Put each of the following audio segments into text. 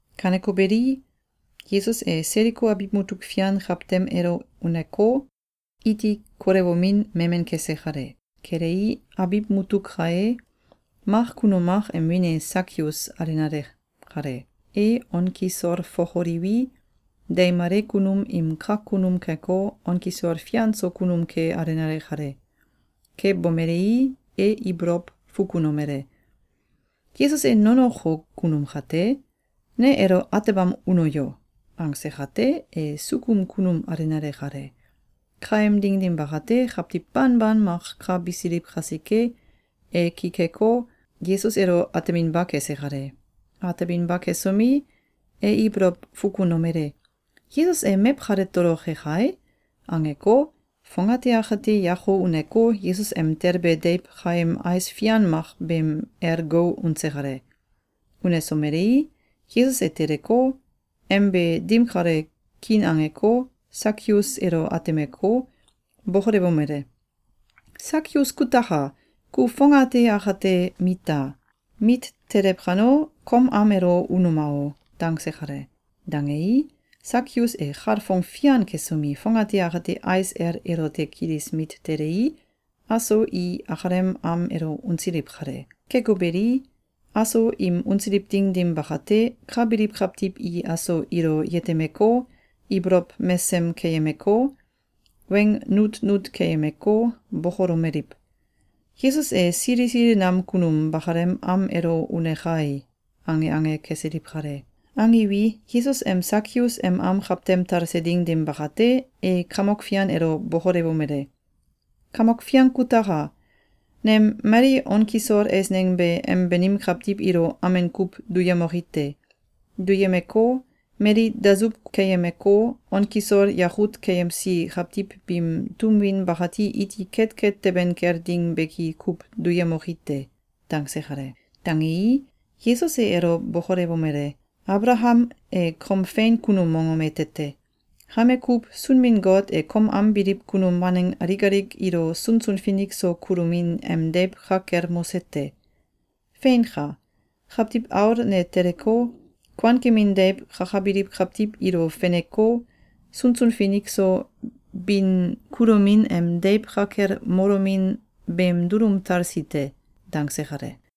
Kaneko beli, Yesus e Seliko abiw mutuk fian kawtem elo uneko, iti kolewomin memen kese kale. Kelei, abiw mutuk ka e, mak kunum mak em wiin e Sakius alenale kale. E on kisol fokoliwi, deimale kunum im kak kunum keko, on kisol fian so kunum ke alenale kale. Ke bomelei, e ibolow fukunomele: “Yesus e nonoko kunum kate? Ne elo atebam uno yo!”, angse kate, e sukum kunum alenale kale. Kaem ding dim bakate, kawtiw banban mak ka bisiliw kasike, e ki keko, Yesus elo ateminba kese kale. Ateminba kesomi, e ibolow fukunomele: “Yesus e mew kale toloke kai!”, angeko, fongate akate yako uneko, Yesus em telbe deiw kaem ais fian mak beem el gou unse kale. Unesomelei, Yesus e teleko, em be dim kalo kiin angeko, Sakius elo atemeko, bokolewomele: “Sakius kutaka! Ku fongate akate mita! Mit telew kano, kom am elo unuma o!”, dangse kale. Dangei, Sakius e kalfong fian kesomi, fongate akate ais el elote kilis mit telei, aso i akalem am elo unsiliw kale. Keko beli, aso im unsiliw ding dim bakate, ka biliw kawtiw i aso ilo yetemeko, ibolow mesem keyemeko, weng nutnut keyemeko, bokolomeliw: “Yesus e sili sili nam kunum bakalem am elo une kai!”, ange ange kesiliw kale. Angiwi, Yesus em Sakius em am kawtem talse ding dim bakate, e Kamok Fian elo bokolewomele: “Kamok Fian kutaka! Nem mali on kisol eisneng be em banim kawtiw ilo amen kuw duyemoki te. Duyemeko, mali dasuw keyemeko, on kisol yakut keyemsi kawtiw biim tum win bakati iti ketket teben kel ding beki kuw duyemoki te.”, dangse kale. Dangei, Yesus e elo bokolewomele: “Abalakam e kom fein kunum mongom ete te. Kame kuw, Sunbin-Got e kom am biliw kunum waneng alik alik ilo sunsun finik so kulomin em deiw ka kel mose te. Feinka! Kawtiw Aul ne teleko, kuankemin deiw kakabiliw kawtiw ilo feneko, sunsun finik so bin kulomin em deiw ka kel molomin beem dulum talsi te.”, dangse kale.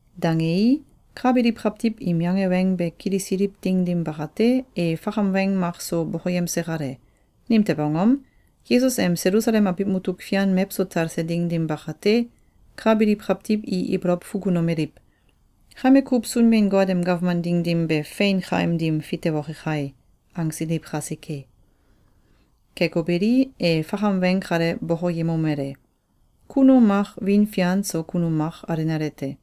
Dangei, ka biliw kawtiw im yange weng be kilisiliw ding dim bakate, e fakam weng mak so bokoyemse kale. Nimtew angom? Yesus em Selusalem abiw mutuk fian mewso talse ding dim bakate, ka biliw kawtiw i ibolow fukunomeliw: “Kame kuw Sunbin-Got em gawman ding dim be fein kaim dim fitewoke kai!”, angsiliw kasike. Keko beli, e fakam weng kale bokoyemomele: “Kunum mak wiin fian so kunum mak alenale te.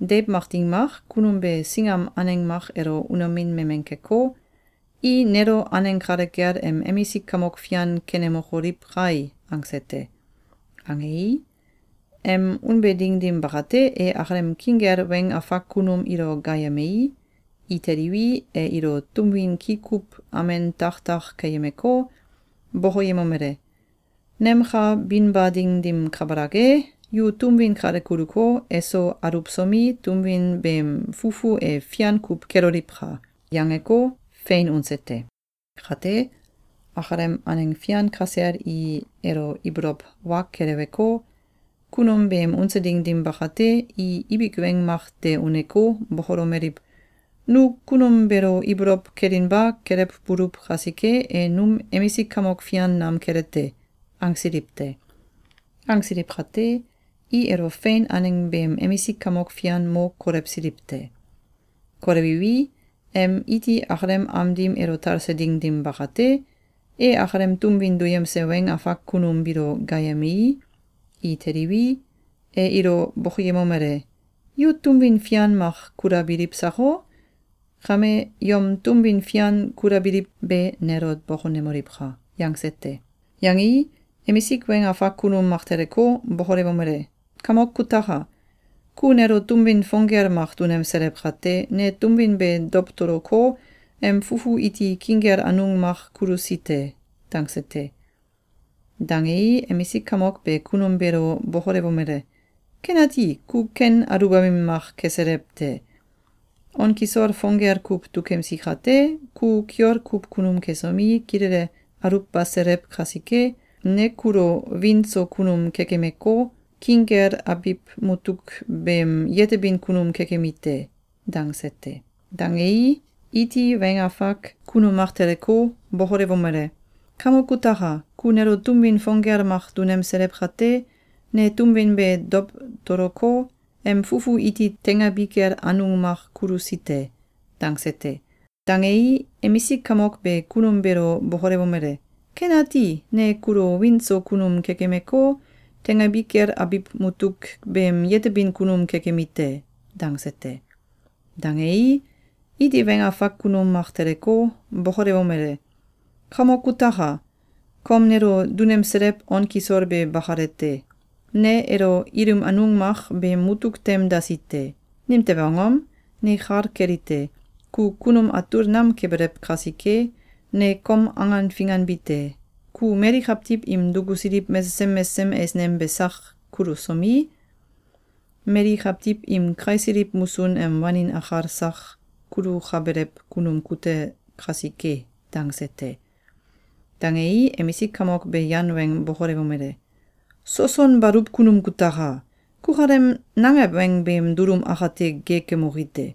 Deiw mak ding mak, kunum be singam aneng mak elo unomin memen keko, ‘I nelo aneng kale kel em emisik kamok fian kenemokoliw kai!’, angse te. Angei, em unbe ding dim bakate, e akalem king kel weng afak kunum ilo gaayemei, i teliwi, e ilo tum win ki kuw amen tak tak keyemeko, bokoyemomele: ‘Nem ka binba ding dim kabalak e, yu tum win kale kuluko, eso aluwsomi, tum win beem fufu e fian kuw keloliwka!’, yangeko, fein unse te. Kate, akalem aneng fian kasel i elo ibolow wa keleweko, kunum beem unse ding dim bakate, i ibik weng mak de uneko, bokolomeliw: ‘Nu kunum beelo ibolow kelinba kelewbuluw kasike, e num emisik kamok fian nam kele te!’, angsiliw te. Angsiliw kate, i elo fein aneng beem emisik kamok fian mo kolewsiliw te. Kolewiwi, em iti akalem am dim elo talse ding dim bakate, e akalem tum win duyemse weng afak kunum biilo gaayemei, i teliwi, e ilo bokoyemomele: ‘Yu tum win fian mak kulabiliw sako? Kame, yom tum win fian kulabiliw be nelo bokonemoliwka!’, yangse te. Yangei, emisik weng afak kunum mak teleko, bokolewomele: ‘Kamok kutaka! Ku nelo tum win fong gel mak dunemselew kate, ne tum win be dowtoloko, em fufu iti king kel anung mak kulusi te.’, dangse te. Dangei, emisik kamok be kunum beelo bokolewomele: ‘Kenati! Ku ken aluwbamin mak keselew te! On kisol fong gel kuw dukemsi kate, ku kiol kuw kunum kesomi, kilele aluwbaselew kasike, ne kulo wiin so kunum kekemeko, king kel abiw mutuk beem yetebin kunum kekemi te.’, dangse te. Dangei, iti weng afak kunum mak teleko, bokolewomele: ‘Kamok kutaka! Ku nelo tum win fong gel mak dunemselew kate, ne tum win be dowtoloko, em fufu iti teingabi kel anung mak kulusi te.’, dangse te. Dangei, emisik kamok be kunum beelo bokolewomele: ‘Kenati! Ne kulo wiin so kunum kekemeko, teingabi kel abiw mutuk beem yetebin kunum kekemi te.’, dangse te. Dangei, iti weng afak kunum mak teleko, bokolewomele: ‘Kamok kutaka! Kom nelo dunemselew on kisol be bakalete. Ne elo ilim anung mak beem mutuk tem dasi te. Nimtew angom? Ne kal kelite: Ku kunum atul nam kebelew kasike, ne kom angan finganbi te. Ku mali kawtiw im dukusiliw mesesem mesesem eisneng be sak kulusomi, mali kawtiw im kaisiliw musun em wanin akal sak kulukabelew kunum kute kasike.’, dangse te. Dangei, emisik kamok be yan weng bokolewomele: ‘Soson baluw kunum kutaka! Kukalem nangew weng beem dulum akate geekemoki te!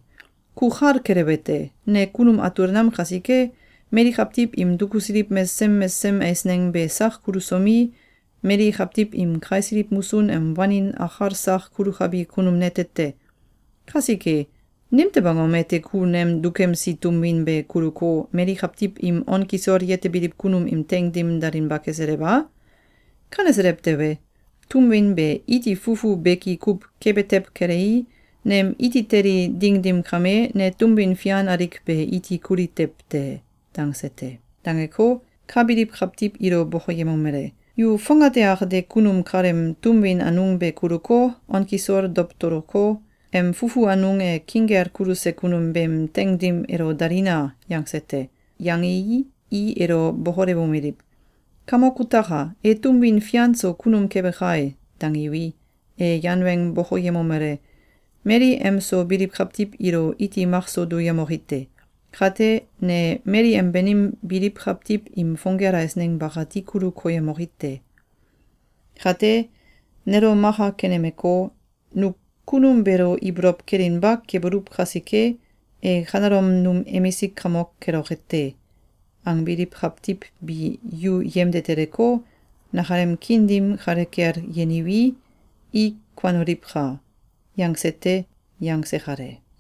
Ku kal kelewete: Ne kunum atul nam kasike, mali kawtiw im dukusiliw mesesem mesesem eisneng be sak kulusomi, mali kawtiw im kaisiliw musun em wanin akal sak kulukabi kunum nete te. Kasike, nimtew angom ete ku nem dukemsi tum win be kuluko, mali kawtiw im on kisol yetebiliw kunum im teing dim dalinba keselew a? Kaneselew tewe, tum win be iti fufu beki kuw kebe tew kelei, nem iti teli ding dim kame, ne tum win fian alik be iti kuli tew te.’, dangse te. Dangeko, ka biliw kawtiw ilo bokoyemomele: ‘Yu fongate akate kunum kaleem tum win anung be kuluko, on kisol dowtoloko, em fufu anung e king kel kuluse kunum beem teing dim elo dalina!’, yangse te. Yangei, i elo bokolewomeliw: ‘Kamok kutaka! E tum win fian so kunum kebe kai!’, dangiwi, e yan weng bokoyemomele: ‘Mali em so biliw kawtiw ilo iti makso duyemoki te. Kate, ne mali em banim biliw kawtiw im fong gel eisneng bakati kulu koyemoki te. Kate, nelo maka kenemeko, ‘Nu kunum beelo ibolow kelinba kebuluw kasike, e kanelom num emisik kamok keloke te!’, angbiliw kawtiw bi yu yemde teleko, nakalem kiin dim kale kel yeniwi, i kuanoliwka!’, yangse te.”, yangse kale.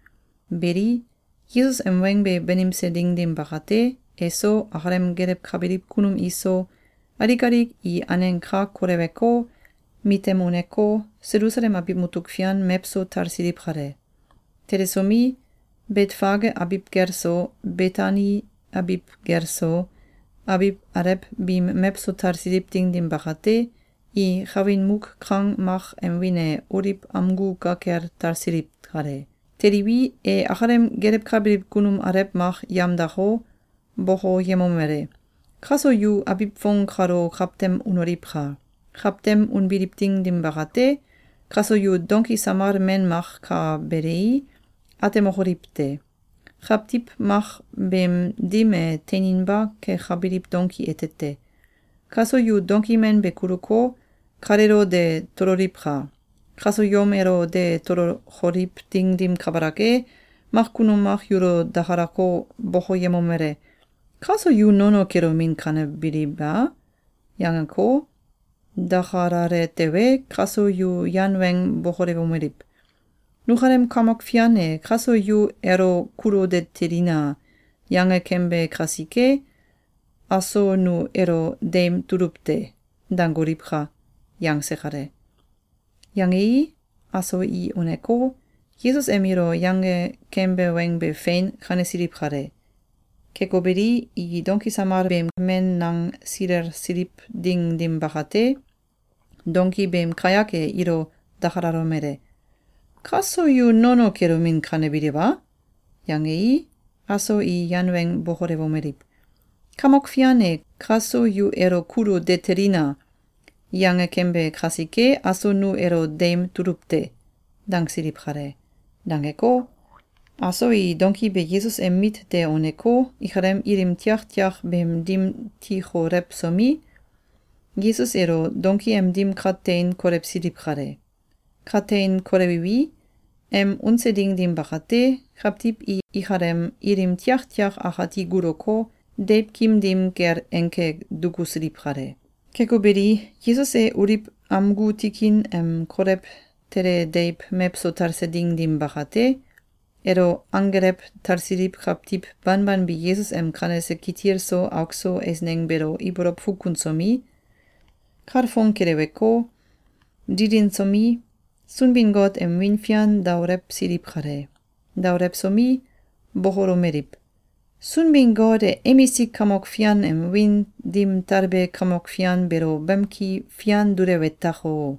Beli, Yesus em weng be banimse ding dim bakate, eso, akalem gelewkabiliw kunum iso, alik alik i aneng ka koleweko, mitem uneko, Selusalem abiw mutuk fian mewso talsiliw kale. Telesomi, Betfage abiw gel so, Betani abiw gel so, abiw alew biim mewso talsiliw ding dim bakate, i kawin muk kang mak em wiin e Oliw amgu ka kel talsiliw kale. Teliwi, e akalem gelewkabiliw kunum alew mak yamdako, bokoyemomele: “Kaso yu abiw fong kalo kawtem unoliwka! Kawtem unbiliw ding dim bakate, kaso yu donki samal men mak ka belei, atemokoliw te. Kawtiw mak beem dim e teininba kekabiliw donki ete te. Kaso yu donki men be kuluko, kaleelo de tololiwka! Kaso yom elo de tolokoliw ding dim kabalak e, mak kunum mak yulo dakalako, bokoyemomele: ‘Kaso yu nono kelomin kanebiliw a?’, yangeko, dakalale tewe, kaso yu yan weng bokolewomeliw: ‘Nukalem Kamok Fian e ‘Kaso yu elo kulu de telina!’, yange kembe kasike, aso nu elo deim tuluw te.’, dangoliwka!”, yangse kale. Yangei, aso i uneko, Yesus em ilo yange kembe weng be fein kanesiliw kale. Keko beli, i donki samal men beem nang silelsiliw ding dim bakate, donki beem kayak e ilo dakalalomele: “Kaso yu nono kelomin kanebiliw a?’, yangei, aso i yan weng bokolewomeliw: “Kamok Fian e ‘Kaso yu elo kulu de telina!’, yange kembe kasike, aso nu elo deim tuluw te.”, dangsiliw kale. Dangeko, aso i donki be Yesus em mit de uneko, ikalem ilim tiaktiak beem dim tikolewsomi, Yesus elo donki em dim ka tein kolewsiliw kale. Ka tein kolewiwi, em unse ding dim bakate, kawtiw i ikalem ilim tiaktiak akati guloko, deiwkim dim kel enke dukusiliw kale. Keko beli, Yesus e Oliw amgu tikin em kolew tele deiw mewso talse ding dim bakate, elo anggelew talsiliw kawtiw banban bi Yesus em kanese kitil so auk so eisneng beelo ibolow fukunsomi, kalfong keleweko, dilinsomi, Sunbin-Got em wiin fian daolewsiliw kale. Daolewsomi, bokolomeliw: “Sunbin-Got e emisik kamok fian em wiin dim talbe kamok fian beelo bamki fian dulewe tako!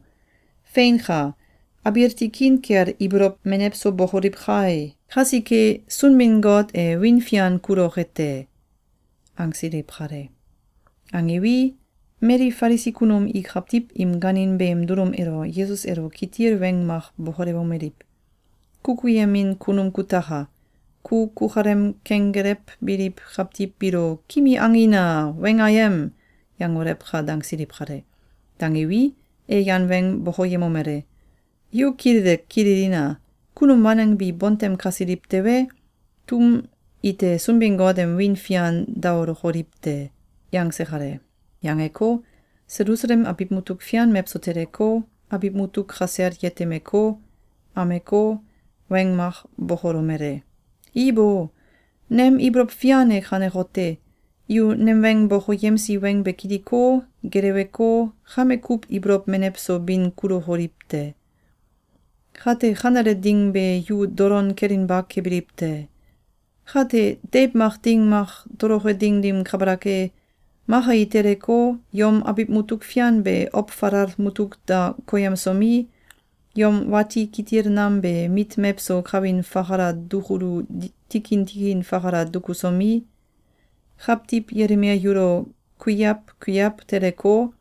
Feinka! Abiil tikin kel ibolow menew so bokoliw kai! Kasike, Sunbin-Got e wiin fian kuloke te.”, angsiliw kale. Angiwi, mali Falisi kunum i kawtiw im gaanin beem dulum elo Yesus elo kitil weng mak bokolewomeliw: “Kukuyemin kunum kutaka! Ku kukalem kenggelewbiliw kawtiw biilo ‘Kimi angina! Weng ayem!’, yangolewka!”, dangsiliw kale. Dangiwi, e yan weng bokoyemomele: “Yu kilele kililina! Kunum waneng bi bontem kasiliw tewe, tum ite Sunbin-Got em wiin fian daolokoliw te.”, yangse kale. Yangeko, Selusalem abiw mutuk fian mewso teleko, abiw mutuk kasel yetemeko, ameko, weng mak bokolomele: “Ibo! Nem ibolow fian e kanekote: Yu nem weng bokoyemsi weng be kiliko, geleweko, kame kuw ibolow menew so bin kulukoliw te. Kate kanele ding be yu dolon kelinba kebiliw te! Kate, deiw mak ding mak toloke ding dim kabalak e, maka i teleko, yom abiw mutuk fian be ow falal mutuk da koyemsomi, yom wati kitil nam be mit mewso kawin fakala dukulu tikin tikin fakala dukusomi, kawtiw yelimel yulo kuiaw kuiaw teleko,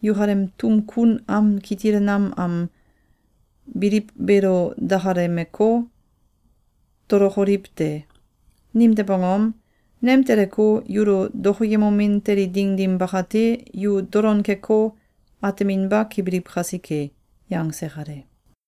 yukalem tum kun am kitil nam am biliw beelo dakalemeko, tolokoliw te. Nimtew angom? Nem teleko, yulo dokoyemomin teli ding dim bakate, yu dolon keko, ateminba kebiliw kasike.”, yangse kale.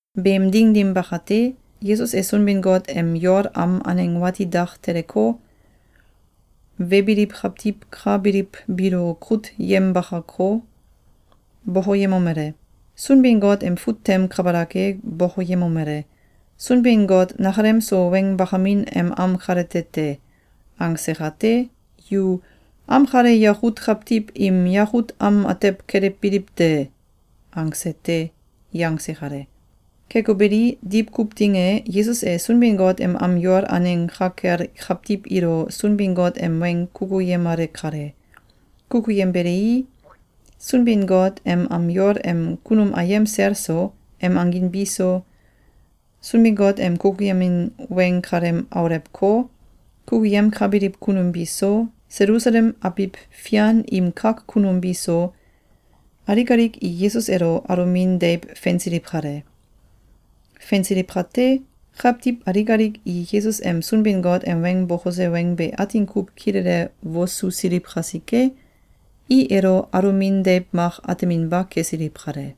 Beem ding dim bakate, Yesus e Sunbin-Got em yol am aneng wati dak teleko, webiliw kawtiw ka biliw biilo kut yembakako, bokoyemomele: “Sunbin-Got em fut tem kabalak e bokoyemomele: ‘Sunbin-Got nakalem so weng bakamin em am kalete te.’, angse kate, yu ‘Am kale yakut kawtiw im yakut am atew kelewbiliw te!’, angse te!”, yangse kale. Keko beli, diwkuw ding e, Yesus e Sunbin-Got em am yol aneng ka kel kawtiw ilo Sunbin-Got em weng kukuyemale kale. Kukuyembelei, Sunbin-Got em am yol em kunum ayem sel so, em angin bi so, Sunbin-Got em kukuyemin weng kalem aulewko, kukuyemkabiliw kunum bi so, Selusalem abiw fian im kak kunum bi so, alik alik i Yesus elo alomin deiw fensiliw kale. Fensiliw kate, kawtiw alik alik i Yesus em Sunbin-Got em weng bokose weng be atin kuw kilele wosusiliw kasike, i elo alomin deiw mak ateminba kesiliw kale.